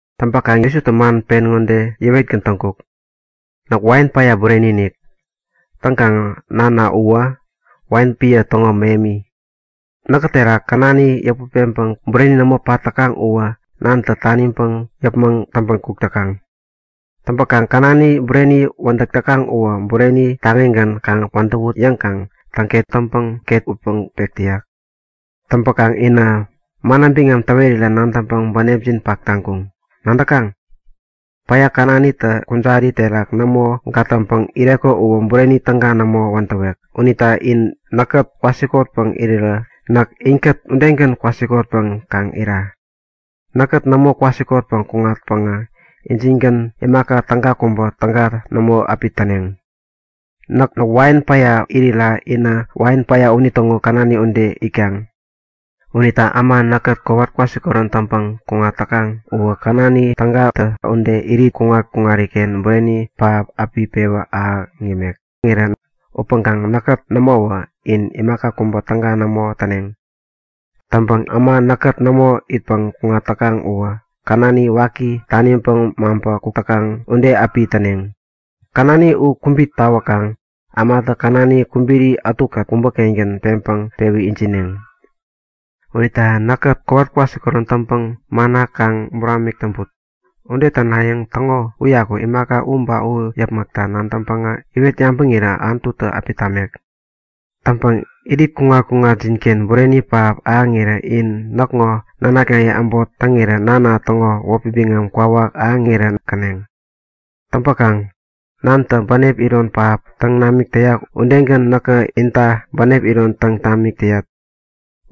Täŋpäkaŋ Jesutä man pen ŋode yäwetgän täŋkuk; Näk wain päya bureni-inik. Täŋkaŋ Nana uwä wain epän täŋo mähemi. Näkä terak känani yäput peŋpäŋ bureni nämo pat täkaŋ uwä Nantä taniŋpäŋ yäpmäŋ täŋpän kuk täkaŋ. Täŋpäŋ känani bureni wädäk täkaŋ uwä bureni taŋigän kaŋ wädäwut yäŋkaŋ täŋket taŋpäŋ ket utpäŋ pek täyak. Täŋpäkaŋ inä, manna biŋam täwerira nadäŋpäŋ bänepjin pak taŋkuŋ. Nadäkaŋ? Päya känanitä kujari terak nämo gatäŋpäŋ ireko uwä bureni täga nämo wädäwek unita in näkkät kwasikotpäŋ irirä näk inkät udegän kwasikotpäŋ kaŋ ira. Näkkät nämo kwasikotpäŋ kuŋatpäŋä injingän imaka täga kubä täga nämo api täneŋ. Näk wain päya irira inä wain päya unitäŋo känani ude itkaŋ. Unita äma näkkät kowat kwasikorän täŋpäŋ kuŋat täkaŋ uwä känani tägatä ude irit kuŋat-kuŋariken bureni pähap api pewän ahäŋ yämek. Upäŋkaŋ näkkät nämowä, in imaka kubä täga nämo täneŋ. Täŋpäŋ äma näkkät nämo itpäŋ kuŋat täkaŋ uwä känani waki taniŋpäŋ maŋpä kuk täkaŋ ude api täneŋ. Känani u kubit tawänkaŋ ämatä känani kubiri ätukät kubä-kengän peŋpäŋ pewä ijineŋ. Unita in näkkät kowat kwasikorän täŋpäŋ manna kaŋ buramik täŋput. Ude tänayäŋ täŋo uyaku imaka u ba u yäpmäkta nadäŋpäŋä iwet yabäŋirä Anututä api tamek. Täŋpäŋ irit kuŋat-kuŋatjinken bureni pähap ahäŋirän in näkŋo nanaknaye äbot täŋirä Nana täŋo wäpi biŋam kwawak ahäŋirän käneŋ. Täŋpäkaŋ Nantä bänep iron pähap täŋ namik täyak udegän näkä inta bänep iron täŋ tamik täyat.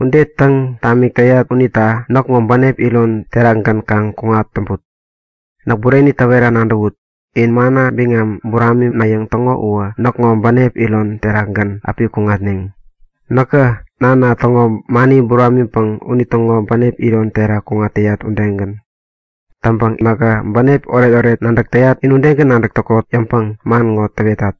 Ude täŋ tamik täyat unita näkŋo bänep iron terakgän kaŋ kuŋat täŋput. Näk bureni täwera nadäwut; In manna biŋam buraminayäŋ täŋo uwä näkŋo bänep iron terakgän api kuŋatneŋ, näkä Nana täŋo mani buramiŋpäŋ unitäŋo bänep iron terak kuŋat täyat udegän. Täŋpäŋ nähä bänep oretoret nadäk täyat in udegän nadäk täkot yäŋpäŋ man ŋo täwetat.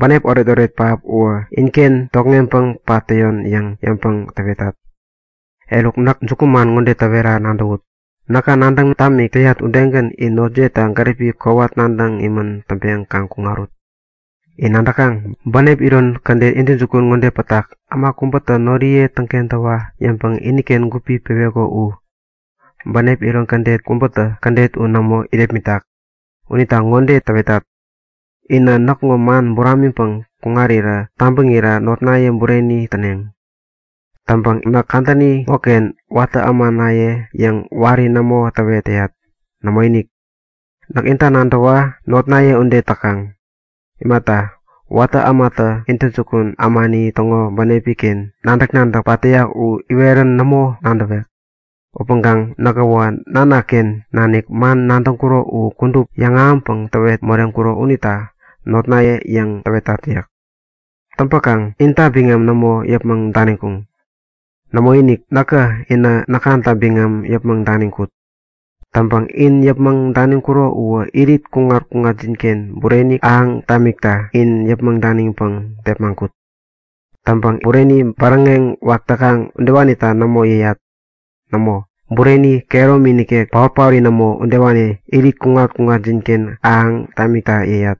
Bänep oretoret pähap u inken tokŋeŋpäŋ pat täyon yäŋ yäŋpäŋ täwetat. Eruk, näk jukuman ŋode täwera nadäwut; Näkä nadäŋ tamik täyat udegän in notjiyeta gäripi kowat nadäŋ imän täŋpeŋ kaŋ kuŋarut. In nadäkaŋ? Bänep iron kädet intäjukun-inik ŋode pätak; Äma kubätä noriye täŋkentäwa yäŋpäŋ iniken gupi peweko u. Bänep iron kädet kubätä kädet u nämo irepmitak. Unita ŋode täwetat; Inä näkŋo man buramiŋpäŋ kuŋarirä tabäŋira notnaye bureni täneŋ. Täŋpäŋ näk kadäni ŋoken watä ämanaye yäŋ wari nämo täwet täyat. Nämoinik! Näkä inta nadäwa notnaye ude täkaŋ. Imata, watä ämatä intäjukun ämani täŋo bänepi-ken nadäk-nadäk pat täyak u iwerän nämo nadäwek. Upäŋkaŋ nähäwä Nanaken nanik man nadäŋkuro u kudup yäŋahäŋpäŋ täwet moreŋkuro unita notnaye yäŋ täwetat yäk. Täŋpäkaŋ, intä näk inta biŋam nämo yäpmäŋ daniŋkuŋ. Nämoinik, näkä inä näkŋata biŋam yäpmäŋ daniŋkut. Täŋpäŋ in yäpmäŋ daniŋkuro uwä irit kuŋat-kuŋatjinken bureni ahäŋ tamikta in yäpmäŋ daniŋpäŋ tepmaŋkut. Täŋpäŋ bureni bäräŋeŋ wak täkaŋ udewanita nämo yäyat. Nämo, bureni kehäromi nikek, paot-paori nämo udewani irit kuŋat-kuŋatjinken ahäŋ tamikta yäyat.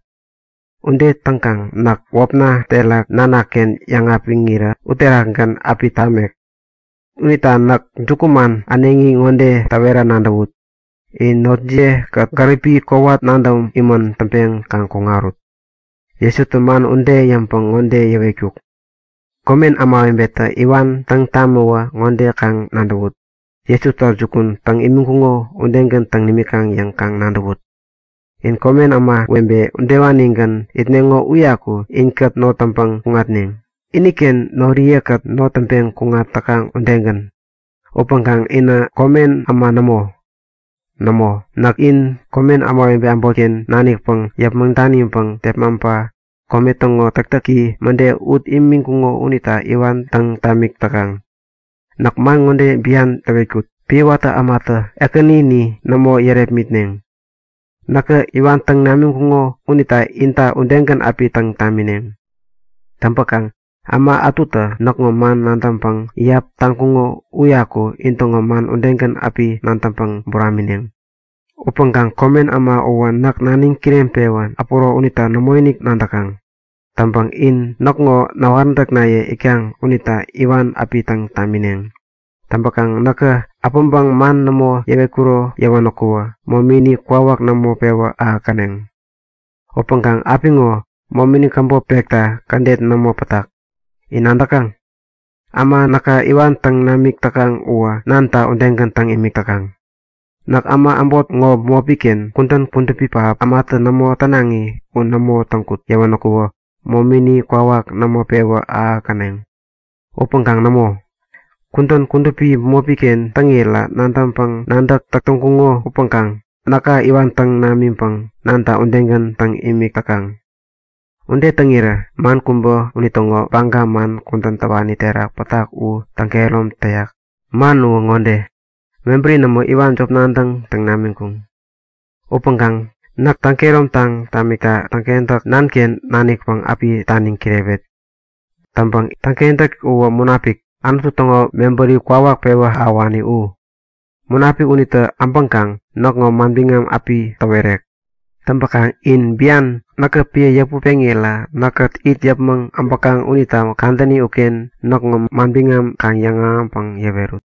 Ude täŋkaŋ näk wäpna terak Nanaken yäŋapiŋirä uterakgän api tamek. Unita näk jukuman äneŋi ŋode täwera nadäwut; In notjiyetakät gäripi kowat nadäŋ imän täŋpeŋ kaŋ kuŋarut. Jesutä man ude yäŋpäŋ ŋode yäwetkuk; Komen ämawebetä iwan täŋ tamäwä ŋode kaŋ nadäwut; Jesuta jukun täŋ imiŋkuŋo udegän täŋ nimikaŋ yäŋ kaŋ nadäwut. In komen ämawebe udewanigän itneŋo uyaku inkät not täŋpäŋ kuŋatneŋ, iniken noriye-kät not täŋpeŋ kuŋat täkaŋ udegän. Upäŋkaŋ inä komen äma nämo. Nämo, näkä in komen ämawebe äbotken nanikpäŋ yäpmäŋ daniŋpäŋ tepmaŋpa kome täŋo täktäki mäde ut imiŋkuŋo unita iwan täŋ tamik täkaŋ. Näk man ŋode bian täwetkut; Epän watä ämatä ekänini nämo yärepmitneŋ. Näka iwan täŋ namiŋkuŋo unita inta udegän api täŋ tamineŋ. Täŋpäkaŋ äma ätutä näkŋo man nadäŋpäŋ iyap täŋkuŋo uyaku intäŋo man udegän api nadäŋpäŋ buramineŋ. Upäŋkaŋ komen äma uwä näk naniŋ kireŋpewän äpuro unita nämoinik nadäkaŋ. Täŋpäŋ in näkŋo näwaräntäknaye itkaŋ unita iwan api täŋ tamineŋ. Täŋpäkaŋ näkä äpäŋpäŋ man nämo yäwetkuro yäwänäku, momini kwawak nämo pewä ahäkkäneŋ. Upäŋkaŋ apiŋo momini käbop pekta kädet nämo pätak. In nadäkaŋ? Äma näka iwan täŋ namik täkaŋ uwä Nanata udegän täŋ imik täkaŋ. Näk äma äbot ŋo bämopi-ken kudän kudupi pähap, ämatä nämo tänaŋi u nämo täŋkut yäwänäku momini kwawak nämo pewä ahäkkäneŋ. Upäŋkaŋ nämo. Kudän kudupi bämopi-ken täŋira nabäŋpäŋ-nadäk täk täŋkuŋo upäŋkaŋ näka iwan täŋ namiŋpäŋ Nanta udegän täŋ imik täkaŋ. Ude täŋirä man kubä unitäŋo baga man kudän täwani terak pätak u täŋkehärom täyak. Man uwä ŋode; Mebäri nämo, iwan jop nadäŋ täŋ namiŋkuŋ. Upäŋkaŋ näk täŋ-kehäromtaŋ tamikta Täŋkentäk, Nanken nanikpäŋ api taniŋ kirewet. Täŋpäŋ Täŋkentäk uwä Munapik, Anutu täŋo mebäri kwawak pewä ahäwani u. Munapik unitä äbäŋkaŋ näkŋo manbiŋam api täwerek. Täŋpäkaŋ in bian näkä epän yäput peŋira näkkät it yäpmäŋ äbäkaŋ unita kadäni uken näkŋo manbiŋam kaŋ yäŋahäŋpäŋ yäwerut.